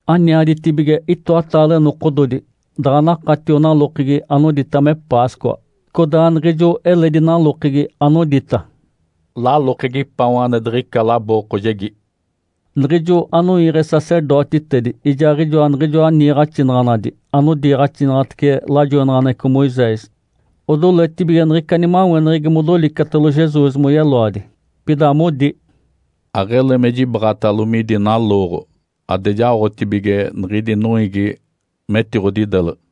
Aniaditibige itoataale nokododi daɡ̶a nakatio nalokegi anodita me Páscoa, codaa niɡ̶ijo eledi nalokegi anodita “Lalokegi paon ane diɡ̶ica labookojegi”. Niɡ̶ijo anoiiɡ̶e sacerdotitedi ijaaɡ̶ijoa niɡ̶ijoa niiɡ̶axinaɡ̶anadi anodiiɡ̶axinaɡ̶atece lajoinaɡ̶aneɡ̶eco Moisés odoletibige niɡ̶ica nimaweneɡ̶egi modolicetalo Jesus moyeloadi. Pida modi, “Aɡ̶ele me jibaɡ̶atalo midi nalooɡ̶o ade jaoɡ̶atibige niɡ̶idi noiigi metiɡ̶odideleɡ̶e.”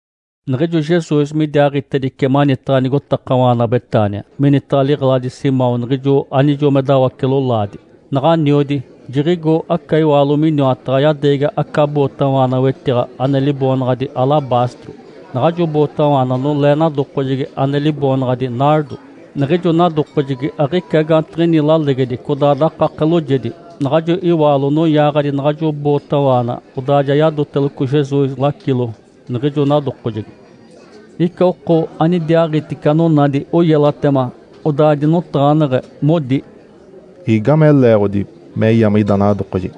Niɡ̶ijo Jesus midiaaɡ̶itedice manitaɡ̶a nigotakawaana Betânia, minitaɡ̶a liɡ̶eladi Simão niɡ̶ijo anijo me dawace-lolaadi. Naɡ̶aniodi, jiɡ̶igo aca iwaalo miniwataɡ̶a yadeegi aca bootawaana wetiɡ̶a ane liboonaɡ̶adi “alabastro”. Naɡ̶ajo bootawaana nolee nadokojegi ane liboonaɡ̶adi “nardo”. Niɡ̶ijo nadokojegi aɡ̶ica gaantiɡ̶ini lalegedi, codaa dakake loojedi. Naɡ̶ajo iwaalo noyaaɡ̶adi naɡ̶ajo bootawaana, odaa ja yadoteloco Jesus lacilo niɡ̶ijo nadokojegi. Ica oko anidiaaɡ̶itice anonadi oyelatema, odaa dinotaɡ̶aneɡ̶e, modi, “Igame leeɡ̶odi me yame ida nadokojegi?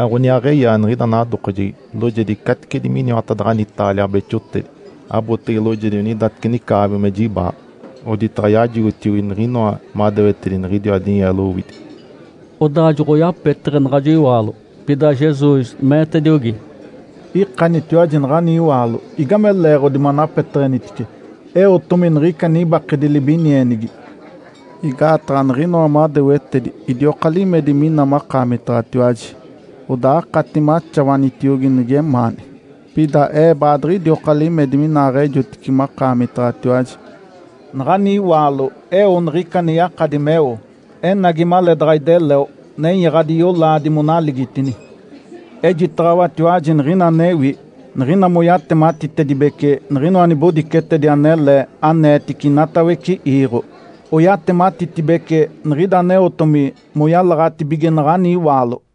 Aɡ̶oniaaɡ̶eyaa niɡ̶ida nadokojegi loojedi caticedi miniwatadaɡ̶ani taalia beexotedi (abotege loojedi onidateci nicaaɡ̶abi me jibaaɡ̶a), oditaɡ̶a yajigotiogi niɡ̶inoa madewetedi niɡ̶idiwa dinyeelo owidi.” Odaa joɡ̶oyapeteɡ̶e naɡ̶ajo iwaalo. Pida Jesus meetediogi, “Ikanitiwaji naɡ̶ani iwaalo! Igame leeɡ̶odi manapeteɡ̶enitice? Eotomi niɡ̶ica nibakedi libinienigi. Igaataɡ̶a niɡ̶inoa madewetedi idioka limedi mina makaamitaɡ̶atiwaji, odaa akati me axawanitiogi nigemaani. Pida Ee baadiɡ̶idioka limedi minaaɡ̶ejotice makaamitaɡ̶atiwaji. Naɡ̶ani iwaalo eo niɡ̶ica ane yakadi meo. Enagi maleedaɡ̶a ideleo nenyaɡ̶adi yolaadi monaligitini. Ejitaɡ̶awatiwaji niɡ̶ina anewi. Niɡ̶ina moyatematitedibece niɡ̶inoa nibodicetedi anele aneetici inatawece iiɡ̶o, oyatematitibece niɡ̶ida aneotomi moyalaɡ̶atibige naɡ̶ani iwaalo.”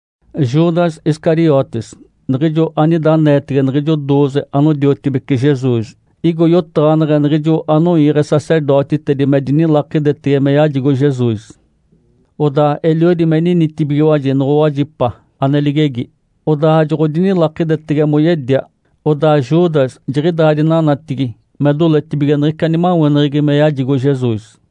Judas Iscariotes niɡ̶ijo anida aneetege niɡ̶ijo dooze anodiotibece Jesus igo yotaɡ̶aneɡ̶e niɡ̶ijo anoiiɡ̶e sacerdotitedi me dinilakidetege me yajigo Jesus. Odaa eliodi me ninitibigiwaji noɡ̶owajipa ane ligegi, odaa joɡ̶odinilakidetege moyedia. Odaa Judas jiɡ̶idaa dinanatigi me doletibige niɡ̶ica nimaweneɡ̶egi me yajigo Jesus.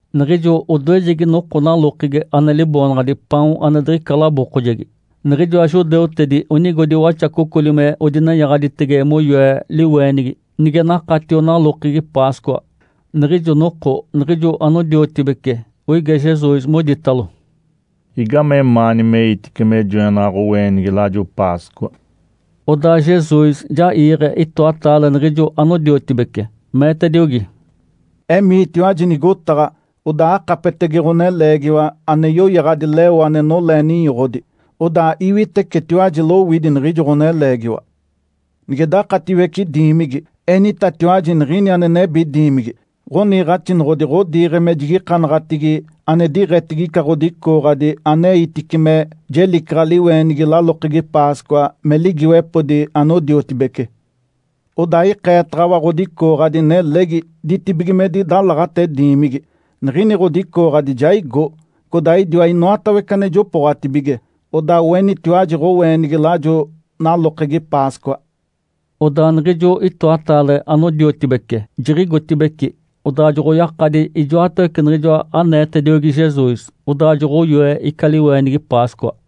Niɡ̶ijo odoejegi noko nalokegi ane liboonaɡ̶adi “Paon ane diɡ̶ica labookojegi”, niɡ̶ijoa judeutedi onigodi waxacocoli me odinenyaɡ̶aditege moyoe liweenigi nige nakatio nalokegi Páscoa. Niɡ̶ijo noko niɡ̶ijo anodiotibece oige Jesus, moditalo, “Igamemaani meitice me joenaɡ̶a ɡ̶oweenigi lajo Páscoa?” Odaa Jesus ja iiɡ̶e itoataale niɡ̶ijo anodiotibece, meetediogi, “Emiitiwaji nigotaɡ̶a, odaa akapetege ɡ̶oneleegiwa ane yoyaɡ̶adi leo ane nolee ninyoɡ̶odi. Odaa iwitecetiwaji lowidi niɡ̶ijo ɡ̶oneleegiwa. Nige dakatiwece diimigi, enitatiwaji niɡ̶ini ane nebi diimigi, ‘Ǥoniiɡ̶axinoɡ̶odi ɡ̶odiiɡ̶e me jigikanaɡ̶atigi ane diɡ̶etigi ica ɡ̶odicooɡ̶adi aneitice me jelicaɡ̶a liweenigi nalokegi Páscoa me ligiiwepodi anodiotibece.’ Odaa ikeetaɡ̶awa ɡ̶odicooɡ̶adi nelegi ditibigimedi dalaɡ̶ate diimigi. Niɡ̶ini ɡ̶odicooɡ̶adi jaigo, codaa idiwa inoatawece ane jopooɡ̶atibige. Odaa oenitiwaji ɡ̶oweenigi lajo nalokegi Páscoa.” Odaa niɡ̶ijo itoataale anodiotibece jiɡ̶igotibeci, odaa joɡ̶oyakadi ijoatawece niɡ̶ijoa aneetediogi Jesus. Odaa joɡ̶oyoe ica liweenigi Páscoa.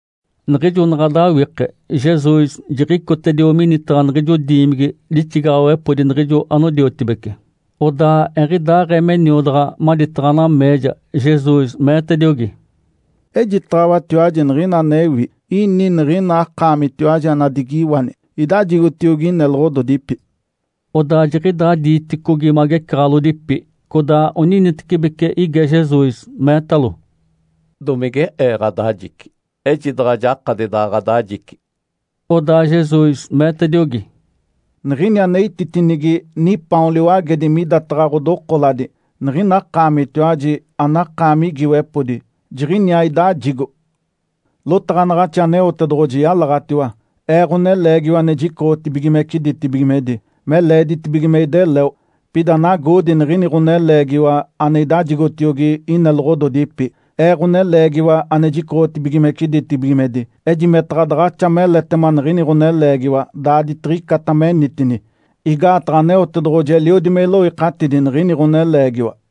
Niɡ̶ijo naɡ̶a dawike, Jesus jiɡ̶icotedio minitaɡ̶a niɡ̶ijo diimigi lixigaɡ̶awepodi niɡ̶ijo anodiotibece. Odaa eɡ̶idaaɡ̶ee me niodaɡ̶a maditaɡ̶a nameeja, Jesus meetediogi, “Ejitaɡ̶awatiwaji niɡ̶ina anewi, ini niɡ̶ina akaamitiwaji anadigiwani, idajigotiogi ineloɡ̶ododipi.” Odaa jiɡ̶idaa diiticogi magecaɡ̶alodipi, codaa oninitecibeci ige Jesus, meetalo, “Domige ee ɡ̶adajici? Ejidaɡ̶a jakadi daɡ̶a ɡ̶adajici!” Odaa Jesus meetediogi, “Niɡ̶ini ane ititinigi nipaon liwagedi midataɡ̶a ɡ̶odokoladi niɡ̶ina akaamitiwaji anakaami igiiwepodi, jiɡ̶iniaa idajigo. Lotaɡ̶anaɡ̶axi Aneotedoɡ̶oji yalaɡ̶atiwa, Ee, Ǥoneleegiwa ane jicoɡ̶otibigimece ditibigimedi, me leeditibige me ideleo. Pida nagoodi niɡ̶ini ɡ̶oneleegiwa ane idajigotiogi ineloɡ̶ododipi, Ee, Ǥoneleegiwa ane jicoɡ̶otibigimece ditibigimedi. Ejimetaɡ̶a daɡ̶axa meletema niɡ̶ini ɡ̶oneleegiwa daaditiɡ̶icata menitini! (Igaataɡ̶a Aneotedoɡ̶oji eliodi me iloikatidi niɡ̶ini ɡ̶oneleegiwa.)”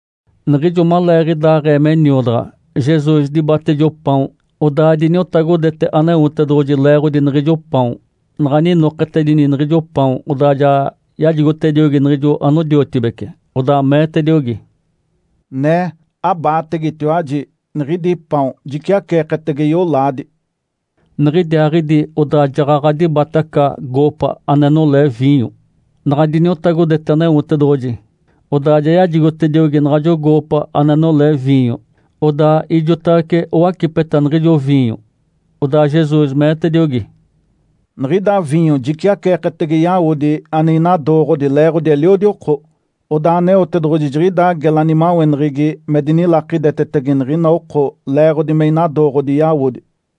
Niɡ̶ijo maleeɡ̶idaaɡ̶ee me niodaɡ̶a, Jesus dibate ijo paon, odaa diniotagodete Aneotedoɡ̶oji leeɡ̶odi niɡ̶ijo paon. Naɡ̶a ninoketedini niɡ̶ijo paon, odaa ja yajigotediogi niɡ̶ijo anodiotibece. Odaa meetediogi, “Nee, abaategetiwaji! Niɡ̶idi paon jiciaceeketege yolaadi.” Niɡ̶idiaaɡ̶idi odaa jaɡ̶aɡ̶a dibate aca goopa ane nolee viinyo. Naɡ̶a diniotagodete Aneotedoɡ̶oji, odaa ja yajigotediogi naɡ̶ajo goopa ane nolee viinyo, odaa ijotawece owacipeta niɡ̶ijo viinyo. Odaa Jesus meetediogi, “Niɡ̶ida viinyo jiciaceeketege yawodi ane inadooɡ̶odi leeɡ̶odi eliodi oko. Odaa Aneotedoɡ̶oji jiɡ̶ida gela nimaweneɡ̶egi me dinilakidetetege niɡ̶ina oko leeɡ̶odi me inadooɡ̶odi yawodi.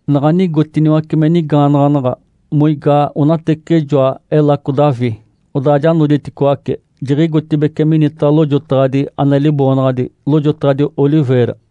Naɡ̶a nigotiniwace me nigaanaɡ̶anaɡ̶a, moigaa onateciɡ̶ijoa Elaco Davi, odaa ja noditicoaci, jiɡ̶igotibeci minitaɡ̶a lojotaɡ̶adi ane liboonaɡ̶adi “Lojotaɡ̶adi Oliveira”.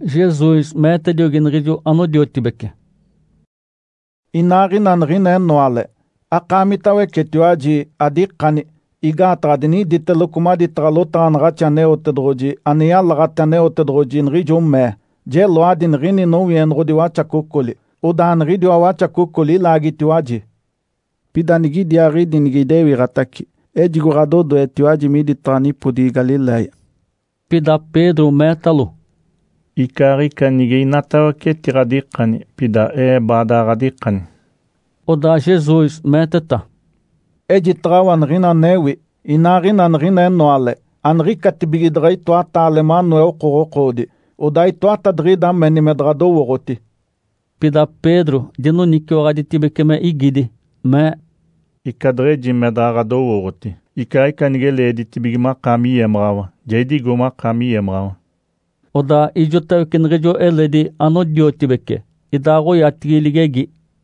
Jesus meetediogi niɡ̶ijo anodiotibece, “Inaaɡ̶ina niɡ̶ina enoale, akaamitawecetiwaji adikani, igaataɡ̶a diniditeloco maditaɡ̶a lotaɡ̶anaɡ̶axi Aneotedoɡ̶oji ane yalaɡ̶ate Aneotedoɡ̶oji, niɡ̶ijo mee, ‘Jeloadi niɡ̶ini nowienoɡ̶odi waxacocoli, odaa niɡ̶idiwa waxacocoli ilaagitiwaji.’ Pida nigidiaaɡ̶idi nige idewiɡ̶atace, ejigo ɡ̶adodoetiwaji miditaɡ̶a nipodigi Galiléia.” Pida Pedro meetalo, “Icaaɡ̶ica nige inatawece etiɡ̶adikani, pida ee baadaɡ̶a ɡ̶adikani!” Odaa Jesus meeteta, “Ejitaɡ̶awa niɡ̶ina anewi. Inaaɡ̶ina niɡ̶ina enoale, aniɡ̶icatibige daɡ̶a itoataale manoe okoɡ̶okoodi, odaa itoatadiɡ̶ida meni me daɡ̶adowooɡ̶oti.” Pida Pedro dinoniciwaɡ̶aditibece me igidi, mee, “Ica deɡ̶eji me daɡ̶a ɡ̶adowooɡ̶oti, icaaɡ̶ica nige leeditibige makaami yemaɡ̶awa, ja idigo makaami yemaɡ̶awa!” Odaa ijotawece niɡ̶ijo eledi anodiotibece idaaɡ̶oyatigi ligegi.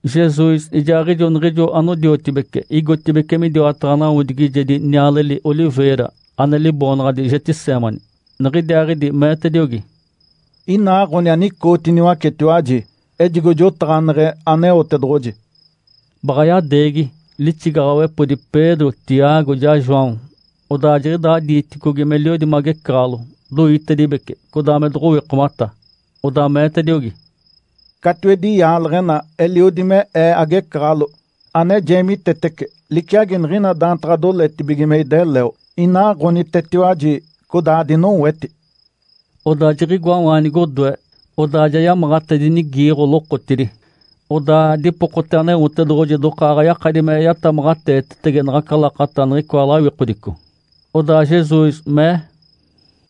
Jesus ijaaɡ̶ijo niɡ̶ijo anodiotibece igotibeci midiwataɡ̶a nawodigijedi nialeli “oliveira” ane liboonaɡ̶adi Getsêmani. Niɡ̶idiaaɡ̶idi meetediogi, “Inaaɡ̶oni anicootiniwacetiwaji, ejigo jotaɡ̶aneɡ̶e Aneotedoɡ̶oji.” Baɡ̶a yadeegi lixigaɡ̶awepodi Pedro, Tiago ijaa João. Odaa jiɡ̶idaa diiticogi meliodi magecaɡ̶alo, doitedibece, codaa me doɡ̶owikomata. Odaa meetediogi, “Catiwedi yaaleɡ̶ena eliodi me Ee agecaɡ̶alo, ane jeemitetece liciagi niɡ̶ina daantaɡ̶a doletibige me ideleo. Inaaɡ̶onitetiwaji, codaa adinoweti.” Odaa jiɡ̶igoawaanigi odoe, odaa ja yamaɡ̶atedinigiiɡ̶o lokotidi, odaa dipokote Aneotedoɡ̶oji dokaaɡ̶a yakadi me yatamaɡ̶ateetetege naɡ̶aca lakata niɡ̶icoa lawikodico. Odaa Jesus mee,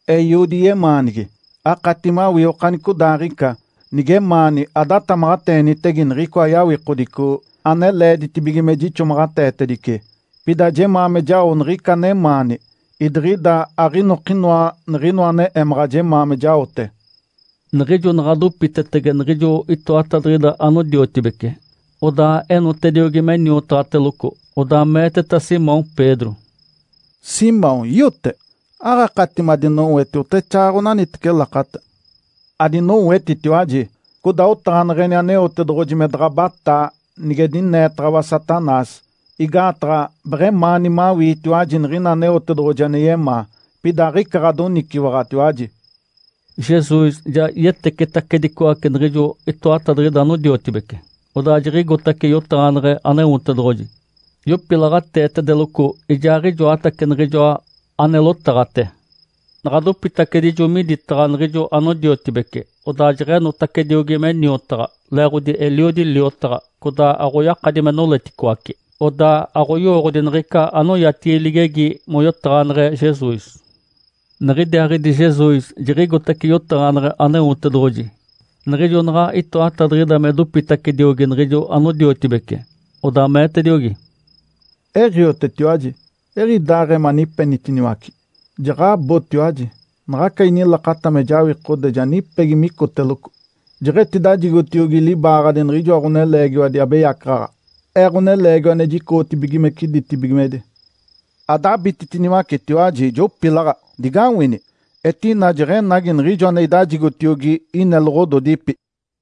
“Eiodi yemaanigi, akati mawii okanicodaaɡ̶ica. Nigemaani adatamaɡ̶ateenitege niɡ̶icoa yawikodico ane leeditibige me jixomaɡ̶ateetedice! Pida jemaa me jao niɡ̶ica anemaani, idiɡ̶ida aɡ̶inokinoa niɡ̶inoa ane emaɡ̶a jemaa me jaote.” Niɡ̶ijo naɡ̶a dopitetege niɡ̶ijo itoatadiɡ̶ida anodiotibece, odaa enotediogi me niotaɡ̶ateloco, odaa meeteta Simão Pedro, “Simão, iote? Aɡ̶akati madinoweti oteɡ̶exaaɡ̶aɡ̶a onaniteci lakata? Adinowetitiwaji, codaa otaɡ̶aneɡ̶eni Aneotedoɡ̶oji me daɡ̶a abataa nige dineetaɡ̶awa Satanás. Igaataɡ̶a beɡ̶emaani mawiitiwaji niɡ̶ina Aneotedoɡ̶oji ane yemaa, pida aɡ̶ica ɡ̶adoniciwaɡ̶atiwaji.” Jesus ja yetecetacedicoace niɡ̶ijo itoatadiɡ̶ida anodiotibece, odaa jiɡ̶igotace yotaɡ̶aneɡ̶e Aneotedoɡ̶oji yopilaɡ̶ateetedeloco ijaaɡ̶ijoatace niɡ̶ijoa ane lotaɡ̶ate. Naɡ̶a dopitacedijo miditaɡ̶a niɡ̶ijo anodiotibece, odaa jeɡ̶enotacediogi me niotaɡ̶a. Leeɡ̶odi eliodi me liotaɡ̶a, codaa aɡ̶oyakadi me noleticoace. Odaa aɡ̶oyowooɡ̶odi niɡ̶ica anoyatigi ligegi moyotaɡ̶aneɡ̶e Jesus. Niɡ̶idiaaɡ̶idi Jesus jiɡ̶igotace yotaɡ̶aneɡ̶e Aneotedoɡ̶oji. Niɡ̶ijo naɡ̶a itoatadiɡ̶ida me dopitacediogi niɡ̶ijo anodiotibece, odaa meetediogi, “Eɡ̶iotetiwaji, eɡ̶idaaɡ̶ee manipenitiniwace? Jaɡ̶abotiwaji! Naɡ̶aca inilakata me jawikode ja nipegi micoteloco. Jeɡ̶etidajigotiogi libaaɡ̶adi niɡ̶ijoa ɡ̶oneleegiwadi abeyacaɡ̶aɡ̶a, Ee, Ǥoneleegiwa ane jicoɡ̶otibigimece ditibigimedi. Adabititiniwacetiwaji, jopilaɡ̶a! Digawini! Etina jeɡ̶enagi niɡ̶ijo ane idajigotiogi ineloɡ̶ododipi.”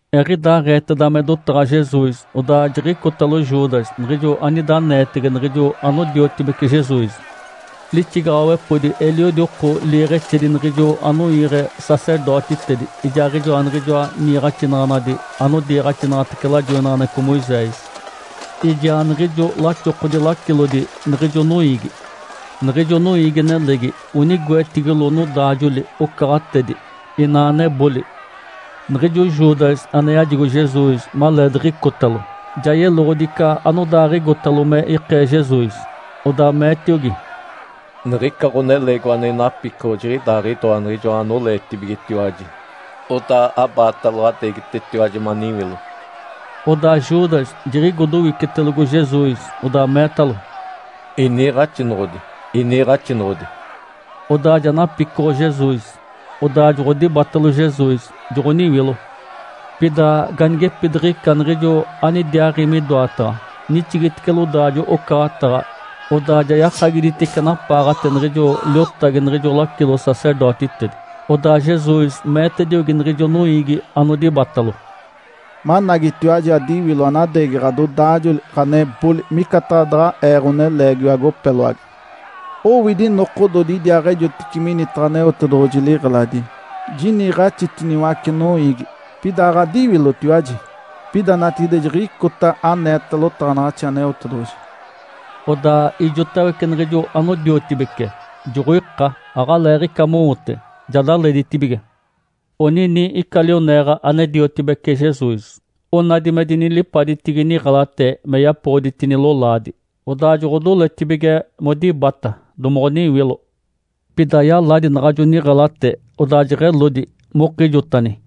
Eɡ̶idaaɡ̶eeteda me dotaɡ̶a Jesus, odaa jiɡ̶icotalo Judas niɡ̶ijo anida aneetege niɡ̶ijo anodiotibece Jesus. Lixigaɡ̶awepodi eliodi oko liiɡ̶exedi niɡ̶ijo anoiiɡ̶e sacerdotitedi ijaaɡ̶ijoa niɡ̶ijoa niiɡ̶axinaɡ̶anadi anodiiɡ̶axinaɡ̶atece lajoinaɡ̶aneɡ̶eco Moisés, ijaa niɡ̶ijo laxokodi lacilodi niɡ̶ijo noiigi. Niɡ̶ijo noiigi-nelegi onigoetigilo nodaajoli-ocaɡ̶atedi inaa neboli. Niɡ̶ijo Judas ane yajigo Jesus maleediɡ̶icotalo, ja yeloɡ̶odi ica anodaaɡ̶igotalo me ikee Jesus. Odaa meetiogi, “Niɡ̶ica ɡ̶oneleegiwa ane inapicoɡ̶o jiɡ̶idaaɡ̶idoa niɡ̶ijoa anoleetibigetiwaji. Odaa abaatalo, adeegitetiwaji maniwilo.” Odaa Judas jiɡ̶igo dowicetelogo Jesus, odaa meetalo, “Iniiɡ̶axinoɡ̶odi, iniiɡ̶axinoɡ̶odi!”, odaa ja napicoɡ̶o Jesus. Odaa joɡ̶odibatalo Jesus, joɡ̶oniwilo. Pida ganigepidiɡ̶ica niɡ̶ijo anidiaaɡ̶i midoataɡ̶a nixigitice lodaajo-ocaɡ̶ataɡ̶a, odaa ja yakagiditice napaaɡ̶ate niɡ̶ijo liotagi niɡ̶ijo lacilo-sacerdotitedi. Odaa Jesus meetediogi niɡ̶ijo noiigi anodibatalo, “Managitiwaji adiwilo anadeegi ɡ̶adodaajoli, ɡ̶aneboli micataɡ̶a daɡ̶a Ee ɡ̶oneleegiwa agopeloagi. Owidi nokododi idiaaɡ̶ejotice minitaɡ̶a Aneotedoɡ̶oji liɡ̶eladi, jiniiɡ̶axitiniwace noiigi, pida aɡ̶adiwilotiwaji. Pida natigide jiɡ̶icota aneeta lotaɡ̶anaɡ̶axi Aneotedoɡ̶oji.” Odaa ijotawece niɡ̶ijo anodiotibece joɡ̶oika aɡ̶aleeɡ̶ica mowote, ja daleditibige. Onini ica lioneeɡ̶a ane diotibece Jesus. Onadi me dinilipaditigi niɡ̶elate me yapoɡ̶oditini lolaadi. Odaa joɡ̶odoletibige modibata domoɡ̶oniwilo. Pida yaladi naɡ̶ajo niɡ̶elate, odaa jeɡ̶elodi mokijotani.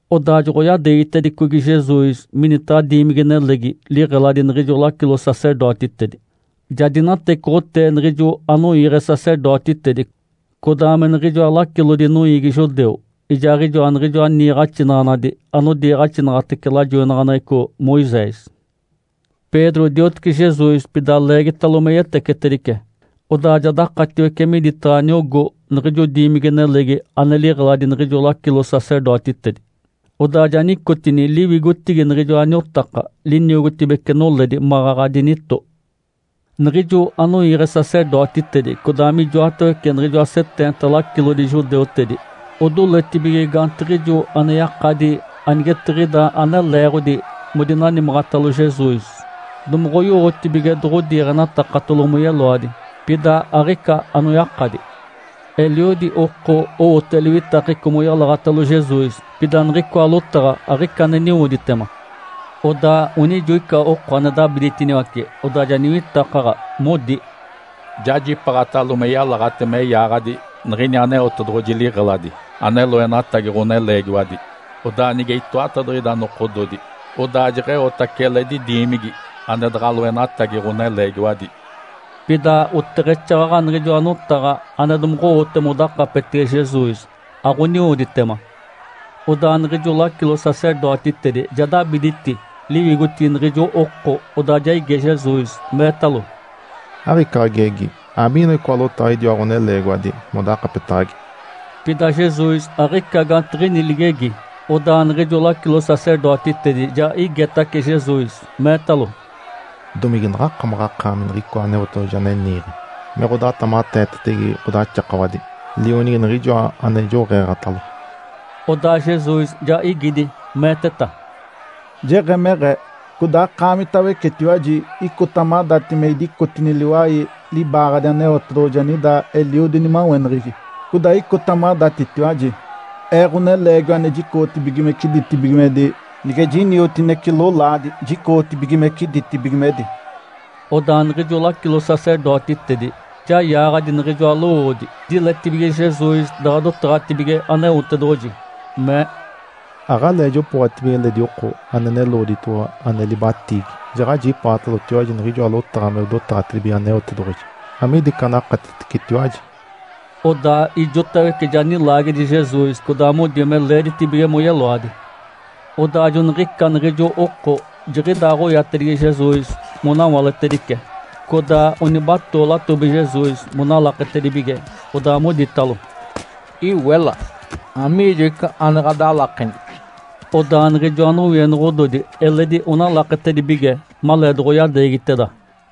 Odaa joɡ̶oyadeegitedicogi Jesus minitaɡ̶a diimigi-nelegi liɡ̶eladi niɡ̶ijo lacilo-sacerdotitedi. Ja dinatecoɡ̶otee niɡ̶ijo anoiiɡ̶e sacerdotitedi, codaa me niɡ̶ijoa lacilodi noiigi judeu ijaaɡ̶ijoa niɡ̶ijoa niiɡ̶axinaɡ̶anadi anodiiɡ̶axinaɡ̶atece lajoinaɡ̶aneɡ̶eco Moisés. Pedro diotece Jesus pida leegitalo me yetecetedice, odaa ja dakatiwece miditaɡ̶a niogó niɡ̶ijo diimigi-nelegi ane liɡ̶eladi niɡ̶ijo lacilo-sacerdotitedi. Odaa ja nicotini liwigotigi niɡ̶ijoa niotaka liniogotibece noledi maɡ̶aɡ̶a dinito. Niɡ̶ijo anoiiɡ̶e sacerdotitedi codaa mijotawece niɡ̶ijoa seteenta lacilodi judeutedi odoletibige gaantiɡ̶ijo ane yakadi anigetiɡ̶ida ane leeɡ̶odi modinanimaɡ̶atalo Jesus domoɡ̶owotibige doɡ̶odiiɡ̶enatakatalo moyeloadi. Pida aɡ̶ica anoyakadi. Eliodi oko owote liwitakeco moyalaɡ̶atalo Jesus, pida niɡ̶icoa lotaɡ̶a aɡ̶ica ane niwoditema. Odaa onijo ica oko ane dabiditiniwace, odaa ja niwitakaɡ̶a, modi, “Jajipaaɡ̶atalo me yalaɡ̶ate me yaaɡ̶adi niɡ̶ini Aneotedoɡ̶oji liɡ̶eladi ane loenatagi ɡ̶oneleegiwadi, odaa nige itoatadiɡ̶ida nokododi, odaa jeɡ̶eotace eledi diimigi ane daɡ̶a loenatagi ɡ̶oneleegiwadi.” Pida oteɡ̶exaaɡ̶aɡ̶a niɡ̶ijoa notaɡ̶a ane domoɡ̶owote modakapetege Jesus aɡ̶oniwoditema. Odaa niɡ̶ijo lacilo-sacerdotitedi ja dabiditi liwigotigi niɡ̶ijo oko, odaa ja ige Jesus, meetalo, “Aɡ̶ica ɡ̶agegi? Amiinoa icoa lotaɡ̶a idiwa ɡ̶oneleegiwadi modakapetaɡ̶agi?” Pida Jesus aɡ̶ica gaantiɡ̶ini ligegi. Odaa niɡ̶ijo lacilo-sacerdotitedi ja igetace Jesus, meetalo, “Domige naɡ̶akamaɡ̶akaami Niɡ̶icoa Aneotedoɡ̶oji ane niiɡ̶e me ɡ̶odatamaɡ̶ateetege ɡ̶odaxakawadi, Lionigi Niɡ̶ijoa ane joɡ̶eeɡ̶atalo?” Odaa Jesus ja igidi, meeteta, “Jeɡ̶emeɡ̶ee. Codaa akaamitawecetiwaji icota madati me idicotini liwai libaaɡ̶adi Aneotedoɡ̶oji anida eliodi nimaweneɡ̶egi. Codaa icota madatitiwaji, Ee, Ǥoneleegiwa ane jicoɡ̶otibigimece ditibigimedi, nige jiniotinece lolaadi jicoɡ̶otibigimece ditibigimedi.” Odaa niɡ̶ijo lacilo-sacerdotitedi ja yaaɡ̶adi niɡ̶ijoa lowoodi diletibige Jesus daɡ̶a dotaɡ̶atibige Aneotedoɡ̶oji, mee, “Aɡ̶alee jopooɡ̶atibige eledi oko ane neloɡ̶oditoɡ̶owa ane libatiigi. Jaɡ̶ajipaatalotiwaji niɡ̶ijoa lotaɡ̶a me dotaɡ̶atibige Aneotedoɡ̶oji. Amiida ica anakatitecetiwaji?” Odaa ijotawece ja nilaagedi Jesus codaa modi me leeditibige moyeloadi. Odaa joniɡ̶ica niɡ̶ijo oko jiɡ̶idaaɡ̶oyatedigi Jesus monawaletedice. Codaa onibatoo latobi Jesus monalaketedibige, odaa moditalo, “Iwela! Amiijo ica ane ɡ̶adalakeni?” Odaa niɡ̶ijoa nowienoɡ̶ododi eledi onalaketedibige maleedoɡ̶oyadeegiteda.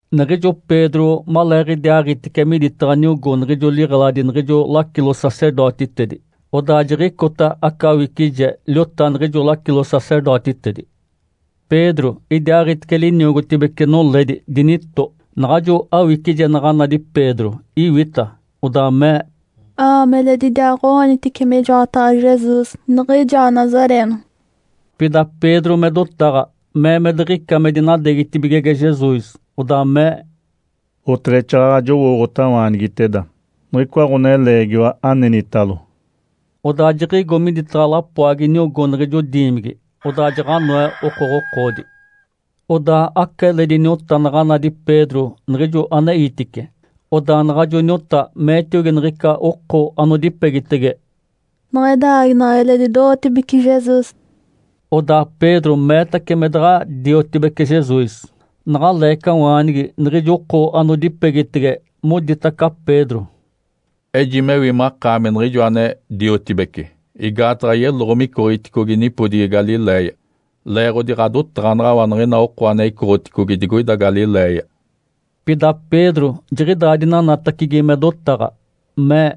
Niɡ̶ijo Pedro maleeɡ̶idiaaɡ̶itice miditaɡ̶a niogó niɡ̶ijo liɡ̶eladi niɡ̶ijo lacilo-sacerdotitedi, odaa jiɡ̶icota aca awicije liota niɡ̶ijo lacilo-sacerdotitedi. Pedro idiaaɡ̶itice liniogotibece noledi dinito. Naɡ̶ajo awicije naɡ̶a nadi Pedro, iwita, odaa mee, “A-aami eledi idiaaɡ̶o-oonitice mijoataɡ̶a Jesus, niɡ̶ijoa Nazareeno.” Pida Pedro me dotaɡ̶a mee me diɡ̶ica me dinadeegitibigege Jesus, odaa mee, “Oteɡ̶exaaɡ̶aɡ̶a jowooɡ̶otawaanigiteda niɡ̶icoa ɡ̶oneleegiwa anenitalo.” Odaa jiɡ̶igo midataɡ̶a lapoagi niogó niɡ̶ijo diimigi. Odaa jaɡ̶anoe okoɡ̶okoodi. Odaa aca eledi niota naɡ̶a nadi Pedro niɡ̶ijo aneitice. Odaa naɡ̶ajo niota meetiogi niɡ̶ica oko anodipegitege, “Niɡ̶ida aaginaɡ̶a eledi do-ootibece Jesus.” Odaa Pedro meetace me daɡ̶a diotibece Jesus. Naɡ̶a leecawaanigi, niɡ̶ijo oko anodipegitege moditaca Pedro, “Ejimewi makaami niɡ̶ijo ane-diotibece, igaataɡ̶a yeloɡ̶o micoɡ̶iticogi nipodigi Galiléia, leeɡ̶odi ɡ̶adotaɡ̶anaɡ̶awa niɡ̶ina oko ane icoɡ̶oticogi digoida Galiléia.” Pida Pedro jiɡ̶idaa dinanatacigi me dotaɡ̶a, mee,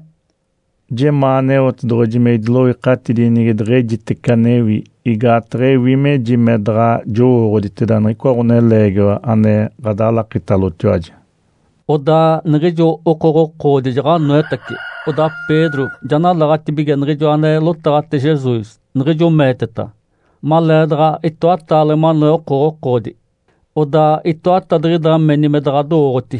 “Jemaa Aneotedoɡ̶oji me idiloikatidi nige deɡ̶ejitece anewi! Igaataɡ̶a ewi meji me daɡ̶a jowooɡ̶oditeda niɡ̶icoa ɡ̶oneleegiwa ane ɡ̶adalakitalotiwaji.” Odaa niɡ̶ijo okoɡ̶okoodi jaɡ̶anoetace. Odaa Pedro ja nalaɡ̶atibige niɡ̶ijoa ane lotaɡ̶ate Jesus, niɡ̶ijo meeteta, “Maleedaɡ̶a itoataale manoe okoɡ̶okoodi, odaa itoatadiɡ̶ida meni me daɡ̶adowooɡ̶oti.”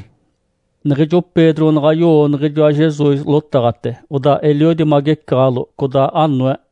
Niɡ̶ijo Pedro naɡ̶a yowo niɡ̶ijoa Jesus lotaɡ̶ate, odaa eliodi magecaɡ̶alo, codaa anoe.